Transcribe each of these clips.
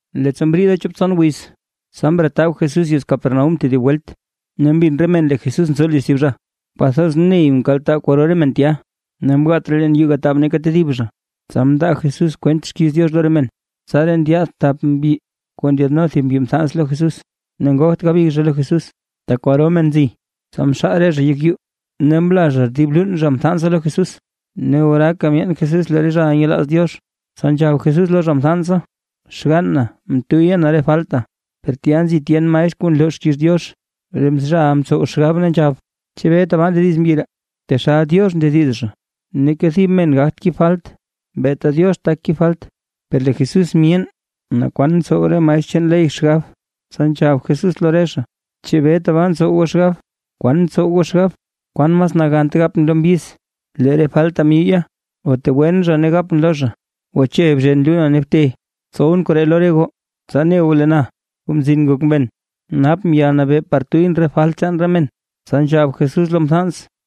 Leettsa mriida chop tson wiz, tsa mretab Jesús yez Capernaúm tedib welt, ne mbin re men lee Jesús nzo liz thib zha. Kwathoz ney mkaltaa kwaro re men tya, ne mgaat raa leen yuu gataab neeka tedib zha, tsa mndaa Jesús kwent xkiiz Diox lo re men. Tsaraa ndyaad thap mbyi kuu ndyaadno thib mbyi mthans lo Jesús. Ne ngogt gabig zha lo Jesús, tak kwaro men nzi, tsa mxaal re zha yek yuu, ne mla zha dib luun zha mthansa lo Jesús. Ne oraaka myeen Jesús lee re zhaʼa nyelaaz Diox. Tsa nzhab Jesús lo zha mthansa: ―Xgann na, mtuyya na re falta. Per tya nzi tyen maestr kuu nloo xkiiz Diox, re zhaʼa mtsow xgab ne nzhab: “¿Chebee tabaa ndediz mbyi ree? ¡Taxal Diox ndediz zha! Neeka thib men gagt kib falt beeta Diox tak kib falt.” Per lee Jesús myeen naa kwan ntsow re maestr chaan ley xgab, tsa nzhab Jesús lo re zha: ―¿Chebee tabaa ntsow goo xgab? ¿Kwan ntsow goo xgab? ¿Kwan mas nagant gapʼn lo mbyiz: “Lee re falta myuyya”, o tegwen zha ne gapʼn lo zha: “Gwache bzhen luuna ne bte”? Tsowʼn koree lo re goo, tsa ne goo lee na, Kuu Mzin Ngok Men, napʼn yalnabee par tuyʼn re falt chaan re men. Tsa nzhab Jesús lo mthans: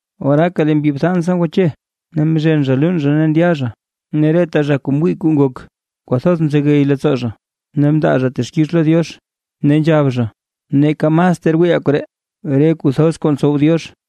Oraaka lee mbyi mthansa ngwache, ne mzhen zha luun zha ne ndya zha, ne reta zha kuu mwii kuu ngok, kwathoz mzegey leettsoo zha, ne mndaa zha texkix lo Diox ne nzhab zha: ―¡Neeka mas ter wiiʼaa koree! ¡Re kuu thoz kuu ntsow Diox!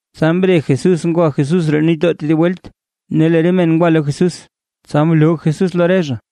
Tsa mre Jesús ngwa Jesús roo nitdoo tedib welt; ne lee re men ngwa lo Jesús, tsa mloo Jesús lo re zha.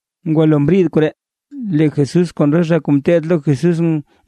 Ngwalo mriid koree, lee Jesús kon re zha kuu ngeteed lo Jesús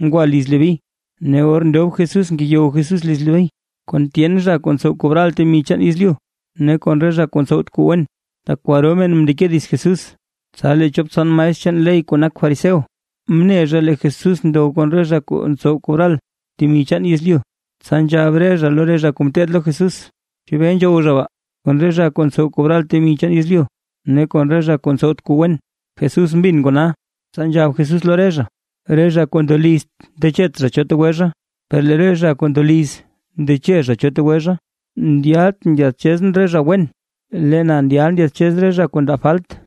ngwa liz Leví, ne or ndob Jesús ngeyow Jesús liz Leví, kon tyen zha kuu ntsow kobral temi chaan yezlyu ne kon re zha kuu ntsowt kuu wen, tak kwaro men mndeke dits Jesús. Tsa lee chop tson maestr chaan ley kuu nak fariseo, mne zha lee Jesús ndow kon re zha kuu ntsow kobral temi chaan yezlyu, tsa nzhab re zha lo re zha kuu ngeteed lo Jesús: ―¿Chebee nzhow zha baa, kon re zha kuu ntsow kobral temi chaan yezlyu, ne kon re zha kuu ntsowt kuu wen? Jesús mbin kona, tsa nzhab Jesús lo re zha: ―Re zha kuu ndolizt ndechet zha cho tegwe zha, per lee re zha kuu ndoliz ndeche zha cho tegwe zha, ndyaltʼn ndyaadchezʼn re zha wen, lee na ndyal ndyaadchez re zha kuu ndab falt.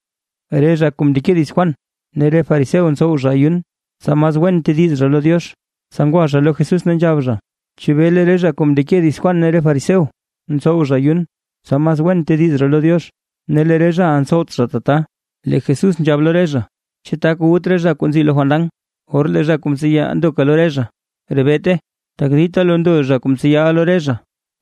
Re zha kuu mndeke dits Juan, ne re fariseo ntsow zha ayun, tsa mas wen tediz zha lo Diox. Tsa ngwa zha lo Jesús ne nzhab zha: ―Chebee lee re zha kuu mndeke dits Juan ne re fariseo, ntsow zha ayun, tsa mas wen tediz zha lo Diox, ne lee re zhaʼa ntsowt zha tata. Lee Jesús nzhab lo re zha: ―¿Chu tak wut re zha kuu nzi lo fandan, or lee zha kuu mtseya ndoka lo re zha? ¡Rebeete! Tak dita lo ndo zha kuu mtseyaʼa lo re zha,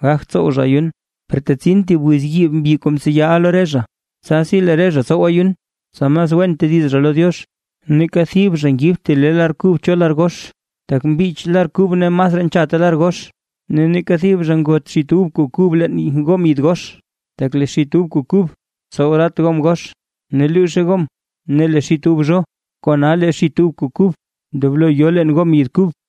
gagt tsow zha ayun. Per tetsin thib wiz yiib mbyi kuu mtseyaʼa lo re zha, tsasi lee re zha tsow ayun, tsa mas wen tediz zha lo Diox. ’Neeka thib zha ngibt thib le lar kub cho lar gox, tak mbich lar kub ne masraa nchatte lar gox. Ne neeka thib zha ngot xit ub kuu kub leen gom yid gox; tak lee xit ub kuu kub tsow ratt gom gox, ne luuzhe gom ne lee xit ub zho, kona lee xit ub kuu kub ndoblo yo leen gom yid kub.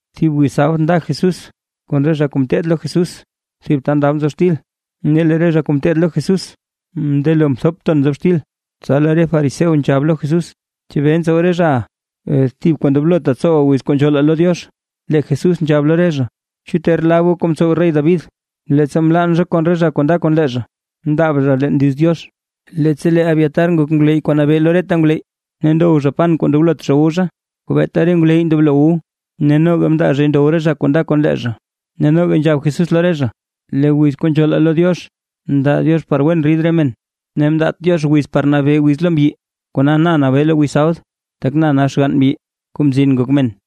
Thib wiz sabd nda Jesús kon re zha kuu ngeteed lo Jesús thib ta ndab nzob xtil, ne lee re zha kuu ngeteed lo Jesús mndelo mthop ton nzob xtil. Tsa lee re fariseo nzhab lo Jesús: ―¿Chebee ntsow re zhaʼa, thib kuu ndoblot tsowaa wiz kuu nzhoolaa lo Diox? Lee Jesús nzhab lo re zha: ―¿Chu ter lab goo kuu mtsow rey David, leettsa mlann zha kon re zha kuu nda kon lee zha? Mndaab zha leen liz Diox, leettsa lee Abiatar ngok ngwleyy kuu mnabee lo reta ngwleyy, ne ndow zha pan kuu ndoblot zha wu zha, kuu beeta re ngwleyy ndoblo wu, ne noga mndaa zhay ndow re zha kuu nda kon lee zha. Ne noga nzhab Jesús lo re zha: ―Lee wiz kuu nzhoolaa lo Diox mndaa Diox par wen rid re men ne mndaat Diox wiz par nabee wiz lo mbyi. Kona na nabee lo wiz sabd, tak na nak xgann mbyi, Kuu Mzin Ngok Men.